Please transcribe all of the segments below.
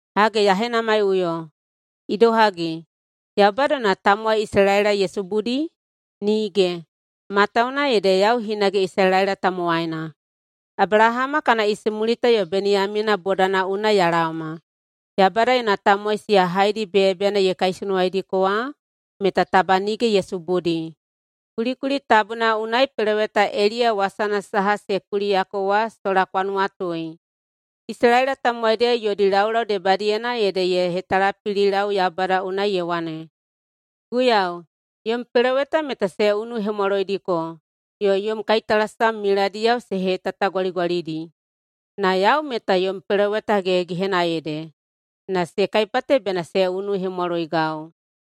Hage ya henamaiꞌuyo: Idohagi, Yaubada yona tamowai Isalaela ye subudi? Nige! Matawuwuna ede yau hinage Isalaela tamowaina, Abelahama kana isimulita yo Beniyamina bodana unai ya laoma. Yaubada yona tamowai siya haedi beyabeyana ye kaisunuwaidiko wa meta taba nige ye subudi. Kulikuli tabuna unai peloweta Eliya wasana saha se kuliyako wa sola kwa nuwatui. Isalaela tamowaidiyao yodi laulau debadiyena ede ye hetalapililau Yaubada unai ye wane, “Guiyau, yom peloweta meta se unuhemwaloidiko yo yom kaitalasam miladiyao se hetatagwaligwalidi. Na yau meta yom peloweta gehegehena ede, na se kaipate bena se unuhemwaloigau.”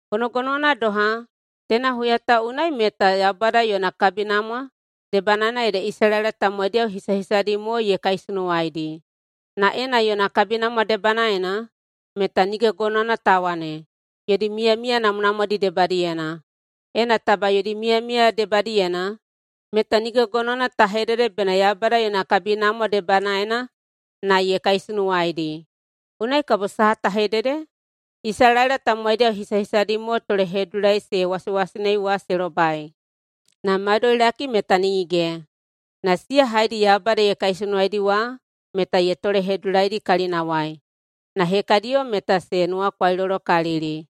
Gonogonowana doha, teina huya ta unai meta Yaubada yona kabinamwa debanaena ede Isalaela tamowaidiyao hisahisadi mo ye kaisunuwaidi. Na ena yona kabinamwa debanaena, meta nige gonowana ta wane, yodi miyamiya namwanamwadi debadiyena. Ena taba yodi miyamiya debadiyena, meta nige gonowana ta hedede bena Yaubada yona kabinamwa debanaena [na ye kaisunuwaidi.] Unai kabo saha ta hedede? Isalaela tamowaidiyao hisahisadi mo tolehedudulai se wasewasenei wa se lobai, na maudoilaki meta nige. Na siya haedi Yaubada ye kaisunuwaidi wa meta ye tolehedudulaidi kalinawai. Na hekadiyo meta se nuwakwailolokalili.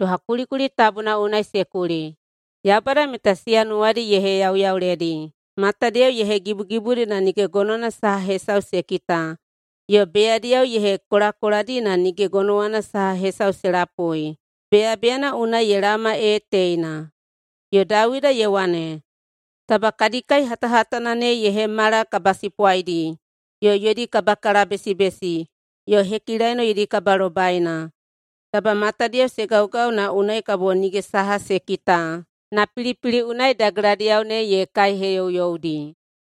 Doha kulikuli tabuna unai se kuli, “Yaubada meta siya nuwadi ye heyauyauledi, matadiyao ye hegibugibudi na nige gonowana saha hesau se kita, yo beyadiyao ye hekolakoladi na nige gonowana saha hesau se lapui, beyabeyana unai ye laoma ee teina.” Yo Dawida ye wane, “Taba kadi kai hatahatana ne ye hemala kabasipwaidi yo yodi kabakalabesibesi yo hekilaino yodi kabalobaina. Taba matadiyao se gaugau na unai kabo nige saha se kita na pilipili unai dageladiyao ne ye kaiheyouyoudi.”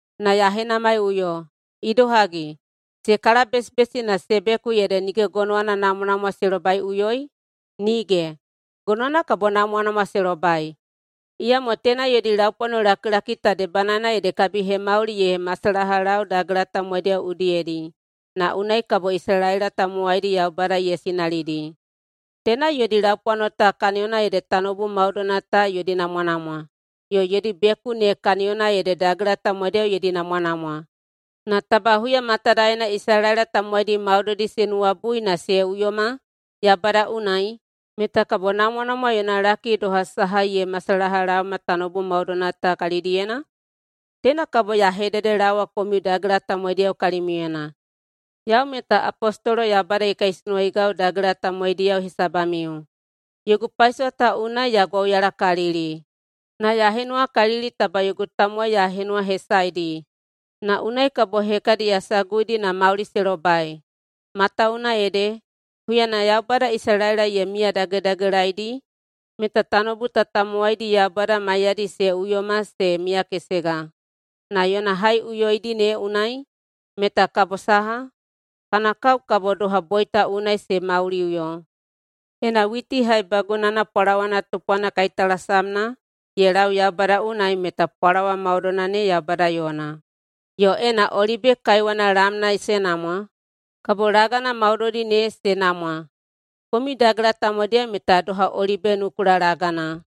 Na ya henamaiꞌuyo: Idohagi, se kalabesibesi na se beku ede nige gonowana namwanamwa se lobaiꞌuyoi? Nige! Gonowana kabo namwanamwa se lobai! Iyamo teina yodi laupwanolakilaki ta debanaena ede kabihemauli ye masalahalau dagela tamowaidiyao udiyedi na unai kabo Isalaela tamowaidi Yaubada ye sinalidi. Teina yodi laupwano ta kaniyona ede tanoubu maudoina ta yodi namwanamwa, yo yodi beku ne kaniyona ede dagela tamowaidiyao yodi namwanamwa. Na taba huya matadaena Isalaela tamowaidi maudoidi se nuwabui na se uyoma Yaubada unai, meta kabo namwanamwa yona laki doha saha ye masalahalaoma tanoubu maudoina ta kalidiyena? Teina kabo ya hededelaowa komiu dagela tamowaidiyao kalimiuyena. Yau meta apostolo Yaubada ye kaisunuwaigau dagela tamowaidiyao hesabamiu. Yogu paisowa ta unai ya gwauyalakalili. Na ya henuwakalili taba yogu tamowai ya henuwahesaedi, na unai kabo hekadi ya saguidi na mauli se lobai. Matawuwuna ede, huyana Yaubada Isalaela ye miyadagedagelaedi meta tanoubu ta tamowaidi Yaubada maiyadi se uyoma se miyakesega. Na yona haiꞌuyoidi ne unai meta kabo saha? Kana kao kabo doha boita unai se mauliꞌuyo. Ena witi haibagunana pwalawana tupwana kaitalasamna ye lau Yaubada unai meta pwalawa maudoina ne Yaubada yona. Yo ena olibe kaiwana lamna se namwa, kabo lagana maudoidi ne se namwa. Komiu dagela tamowaidiyao meta doha olibe nukula lagana.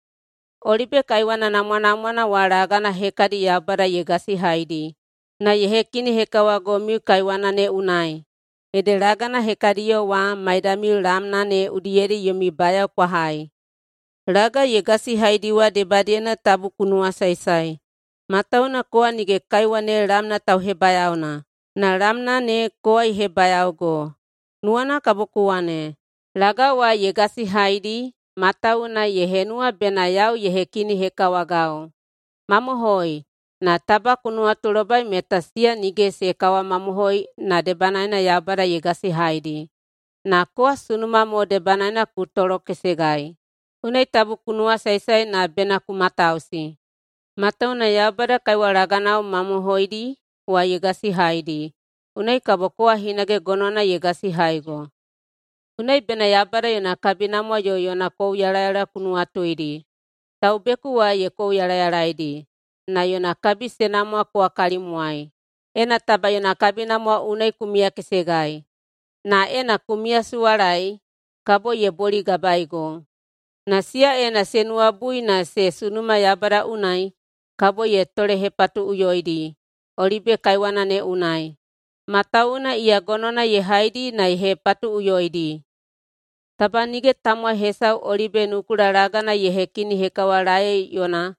Olibe kaiwana namwanamwana wa lagana hekadi Yaubada ye gasihaidi na ye hekinihekawagomiu kaiwana ne unai, ede lagana hekadiyo wa maidamiu lamna ne udiyedi yomi bayao kwa hai. Laga ye gasihaidi wa debadiyena tabu ku nuwasaesae, matawuwuna kowa nige kaiwa ne lamna tauhebayaona, na lamna ne kowa ye hebayaogo. Nuwana kabo ku wane, “Laga wa ye gasihaidi matawuwuna ye henuwa bena yau ye hekinihekawagau.” Mamohoi. Na taba ku nuwatulobai meta siya nige se kawamamohoi na debanaena Yaubada ye gasihaidi, na kowa sunuma mo debanaena ku tolokesegai. Unai tabu ku nuwasaesae na bena ku matausi, matawuwuna Yaubada kaiwa laganao mamohoidi wa ye gasihaidi, unai kabo kowa hinage gonowana ye gasihaigo. Unai bena Yaubada yona kabinamwa yo yona kouyalayala ku nuwatuidi. Taubeku wa ye kouyalayalaidi, na yona kabi se namwa kowa kalimwai, ena taba yona kabinamwa unai ku miyakesegai. Na ena ku miyasuwalaei, kabo ye boligabaego. Na siya ena se nuwabui na se sunuma Yaubada unai, kabo ye tolehepatuꞌuyoidi olibe kaiwana ne unai, matawuwuna iya gonowana ye haidi na ye hepatuꞌuyoidi. Taba nige tamowai hesau olibe nukula lagana ye hekinihekawalaei yona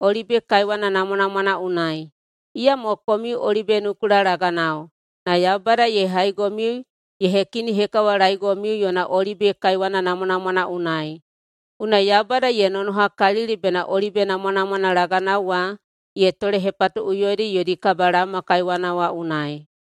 olibe kaiwana namwanamwana unai. Iyamo komiu olibe nukula laganao, na Yaubada ye haigomiu ye hekinihekawalaeigomiu yona olibe kaiwana namwanamwana unai. Unai Yaubada ye nonohakalili bena olibe namwanamwana laganao wa ye tolehepatuꞌuyoidi yodi kabalaoma kaiwana wa unai.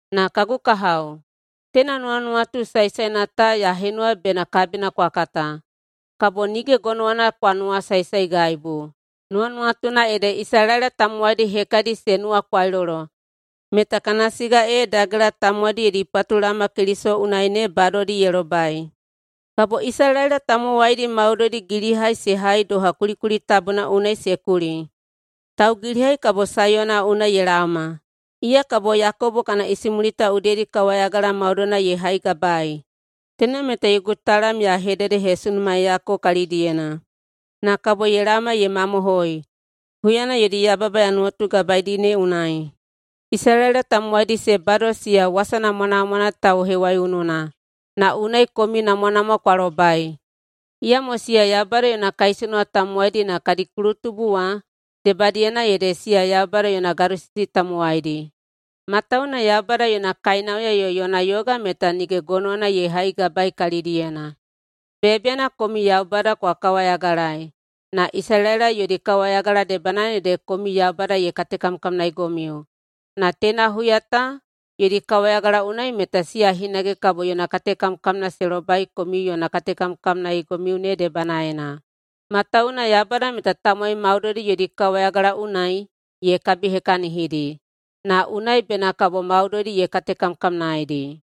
Na kagu kahao, teina nuwanuwatu saesaena ta ya henuwa bena kabina kwa kata. Kabo nige gonowana kwa nuwasaesaegaibu. Nuwanuwatuna ede, Isalaela tamowaidi hekadi se nuwakwailolo meta kana siga ee dagela tamowaidi yodi patulaoma Keliso unai ne badodi ye lobai. Kabo Isalaela tamowaidi maudoidi gilihai se hai doha kulikuli tabuna unai se kuli, “Taugilihai kabo Saiyona unai ye laoma. Iya kabo Yakobo kana isimulita udiyedi kawayagala maudoina ye haigabaei. Teina meta yogu talam ya hededehesunumaeiyako kalidiyena na kabo ye laoma ye mamohoi, huyana yodi yababa ya nuwatugabaeidi ne unai.” Isalaela tamowaidi se bado siya wasa namwanamwana tauhewaiununa, na unai komiu namwanamwa kwa lobai. Iyamo siya Yaubada yona kaisunuwa tamowaidi na kadi kulutubu wa debadiyena ede siya Yaubada yona gadosisi tamowaidi, matawuwuna Yaubada yona kainauya yo yona yoga meta nige gonowana ye haigabaei kalidiyena. Beyabeyana komiu Yaubada kwa kawayagalaei, na Isalaela yodi kawayagala debanaena ede komiu Yaubada ye katekamkamnaeigomiu. Na teina huya ta yodi kawayagala unai meta siya hinage kabo yona katekamkamna se lobai komiu yona katekamkamnaeigomiu ne debanaena. Matawuwuna Yaubada meta tamowai maudoidi yodi kawayagala unai ye kabihekahinidi, na unai bena kabo maudoidi ye katekamkamnaeidi.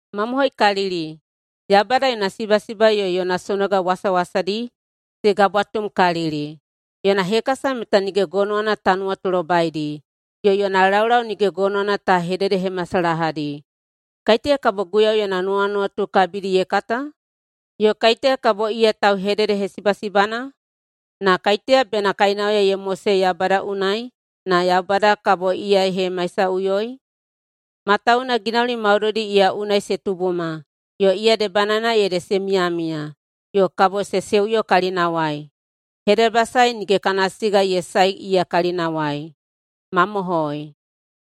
Mamohoikalili! Yaubada yona sibasiba yo yona sonoga wasawasadi se gabwatumkalili, yona hekasa meta nige gonowana ta nuwatulobaidi, yo yona laulau nige gonowana ta hededehemasalahadi. “Kaiteya kabo Guiyau yona nuwanuwatu kabidi ye kata? Yo kaiteya kabo iya tauhededehesibasibana?” “Na kaiteya bena kainauya ye mosei Yaubada unai, na Yaubada kabo iya ye hemaisaꞌuyoi?” Matawuwuna ginauli maudoidi iya unai se tubuma, yo iya debanaena ede se miyamiya, yo kabo se seuyo kalinawai. Hedebasae nige kana siga ye sae iya kalinawai. Mamohoi!